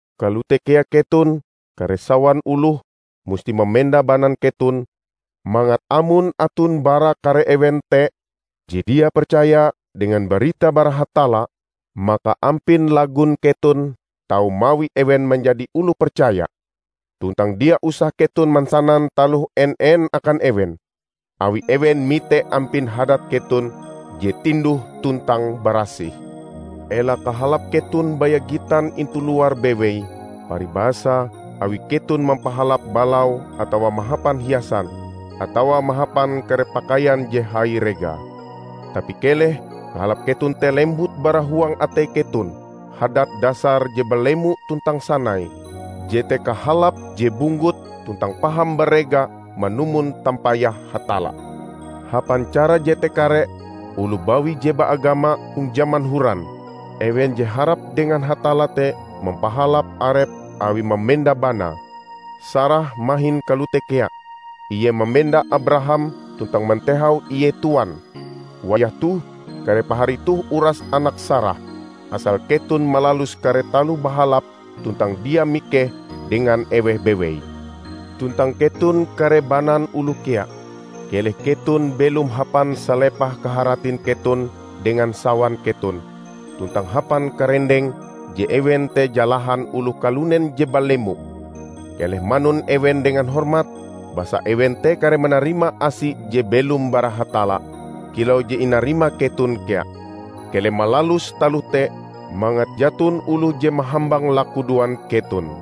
Kalote kea keton, kare sawan oloh, musti mamenda banan keton mangat amon aton bara kare ewen te je dia percaya dengan barita bara Hatalla, maka ampin lagon keton tau mawi ewen manjadi oloh percaya. Tuntang dia usah keton mansanan taloh en-en akan ewen, awi ewen mite ampin hadat keton je tinduh tuntang barasih. Ela kahalap keton baya gitan intu luar bewei, paribasa awi keton mampahalap balau atawa mahapan hiasan, atawa mahapan kare pakaian je hai regae. Tapi keleh kahalap keton te lembut bara huang atei keton, hadat dasar je balemo tuntang sanai; jete kahalap je bunggut tuntang paham barega manumon tampayah Hatalla. Hapan cara jete kare oloh bawi je baagama hong jaman horan, ewen je harap dengan Hatalla te mampahalap arepe awie mamenda banae. Sarah mahin kalote kea, ie mamenda Abraham tuntang mantehau ie tuan. Wayah toh kare pahari toh uras anak Sarah, asal keton malalus kare taloh bahalap tuntang dia mikeh dengan eweh bewei. Tuntang keton kare banan oloh kea, keleh keton belom hapan salepah kaharatin keton dengan sawan keton, tuntang hapan karendeng je ewen te jalahan oloh kalunen je balemo. Keleh manun ewen dengan hormat, basa ewen te kareh manarima asi je belom bara Hatalla kilau je inarima keton kea. Keleh malalus taloh te, mangat jaton oloh je mahambang lakudoan keton.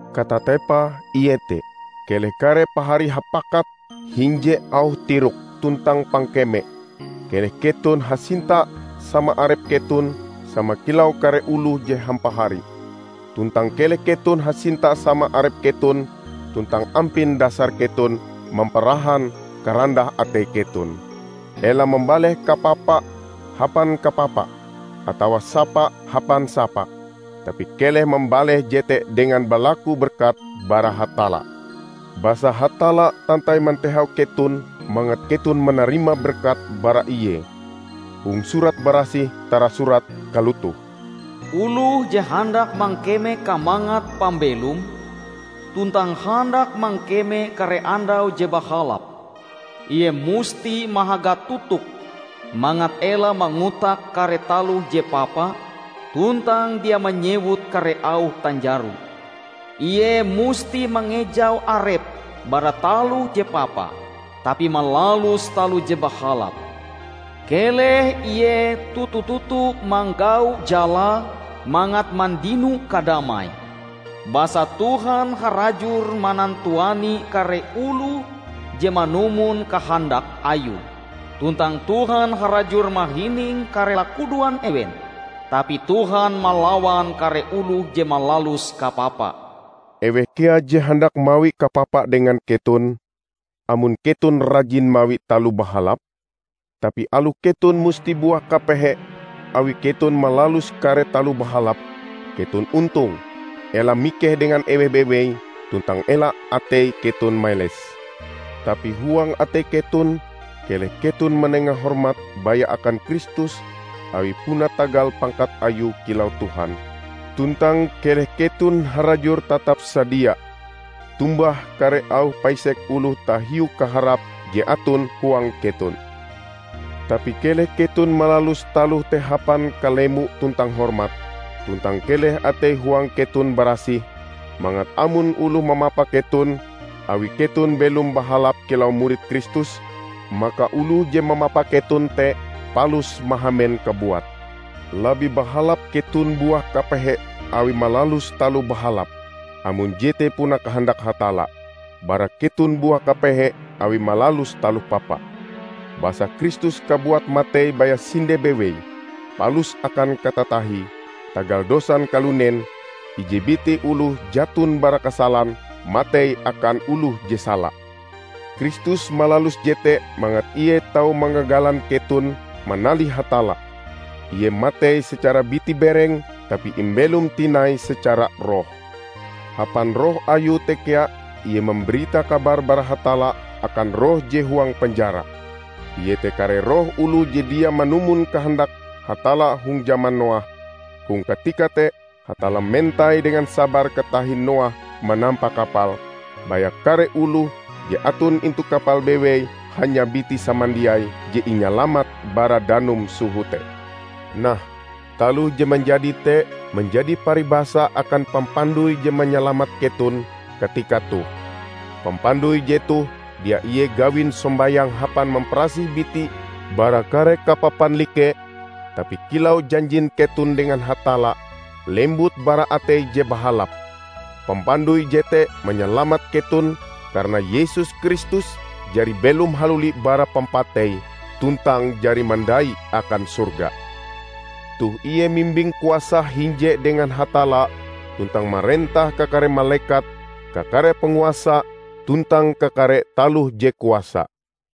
Katatepae iete: Keleh kare pahari hapakat hinje auh tirok tuntang pangkeme. Keleh keton hasinta sama arep keton sama kilau kare oloh je hampahari. Tuntang keleh keton hasinta sama arep keton tuntang ampin dasar keton mamparahan karandah atei keton. Ela mambaleh kapapa hapan kapapa, atawa sapa hapan sapa; tapi keleh mambaleh jete dengan balaku berkat bara Hatalla. Basa Hatalla tantai matehau keton mangat keton manarima berkat bara ie. Hong Surat Barasih tarasurat kalotoh, "Oloh je handak mangkeme kamangat pambelom tuntang handak mangkeme kare andau je bahalap, ie musti mahaga totoke mangat ela mangotak kare taloh je papa tuntang dia manyewut kare auh tanjaro. Ie musti mangejau arep bara taloh je papa tapi malalus taloh je bahalap; keleh ie toto-toto manggau jalae mangat mandino kadamai. Basa Tuhan harajur manantuani kare oloh je manumon kahandak Ayue, tuntang Tuhan harajur mahining kare lakudoan ewen; tapi Tuhan malawan kare oloh je malalus kapapa." Eweh kea je handak mawi kapapa dengan keton, amon keton rajin mawi taloh bahalap? Tapi aloh keton musti buah kapehe awi keton malalus kare taloh bahalap, keton ontong! Ela mikeh dengan eweh bewei, tuntang ela atei keton meles. Tapi huang atei keton, keleh keton manenga hormat baya akan Kristus awi puna tagal pangkat ayue kilau Tuhan. Tuntang keleh keton harajur tatap sadia tombah kare auh paisek oloh tahiu kaharap je aton huang keton. Tapi keleh keton malalus taloh te hapan kalemo tuntang hormat. Tuntang keleh atei-huang keton barasih, mangat amon oloh mamapa keton awi keton belom bahalap kilau murid Kristus, maka oloh je mamapa keton te palus mahamen kabuat. Labih bahalap keton buah kapehe awi malalus taloh bahalap -- amon jete puna kahandak Hatalla -- bara keton buah kapehe awi malalus taloh papa. Basa Kristus kabuat matei baya sinde bewei, palus akan katatahie tagal dosan kalunen -- ije biti oloh jaton bara kasalan, matei akan oloh je sala. Kristus malalus jete mangat ie tau mangagalan keton manalih Hatalla. Ie matei secara biti-bereng, tapi imbelom tinai secara roh. Hapan roh ayue te kea ie mambarita kabar bara Hatalla akan roh je huang penjara: iete kare roh oloh je dia manumon kahandak Hatalla hong jaman Noah. Hong katika te Hatalla mentai dengan sabar katahin Noah manampa kapale. Baya kare oloh je aton intu kapal bewei -- hanya biti samandiaie -- je inyalamat bara danum soho te. Nah, taloh je manjadi te manjadi paribasa akan pampandoi je manyalamat keton katika toh. Pampandoi jetoh dia ie gawin sombayang hapan mamparasih biti bara kare kapapan like, tapi kilau janjin keton dengan Hatalla, lembut bara atei je bahalap. Pampandoi jete manyalamat keton karana Yesus Kristus jari belom haluli bara pampatei, tuntang jari mandai' akan sorga. Toh ie mimbing kuasa hinje dengan Hatalla tuntang marentah kakare malekat, kakare panguasa tuntang kakare taloh je kuasa.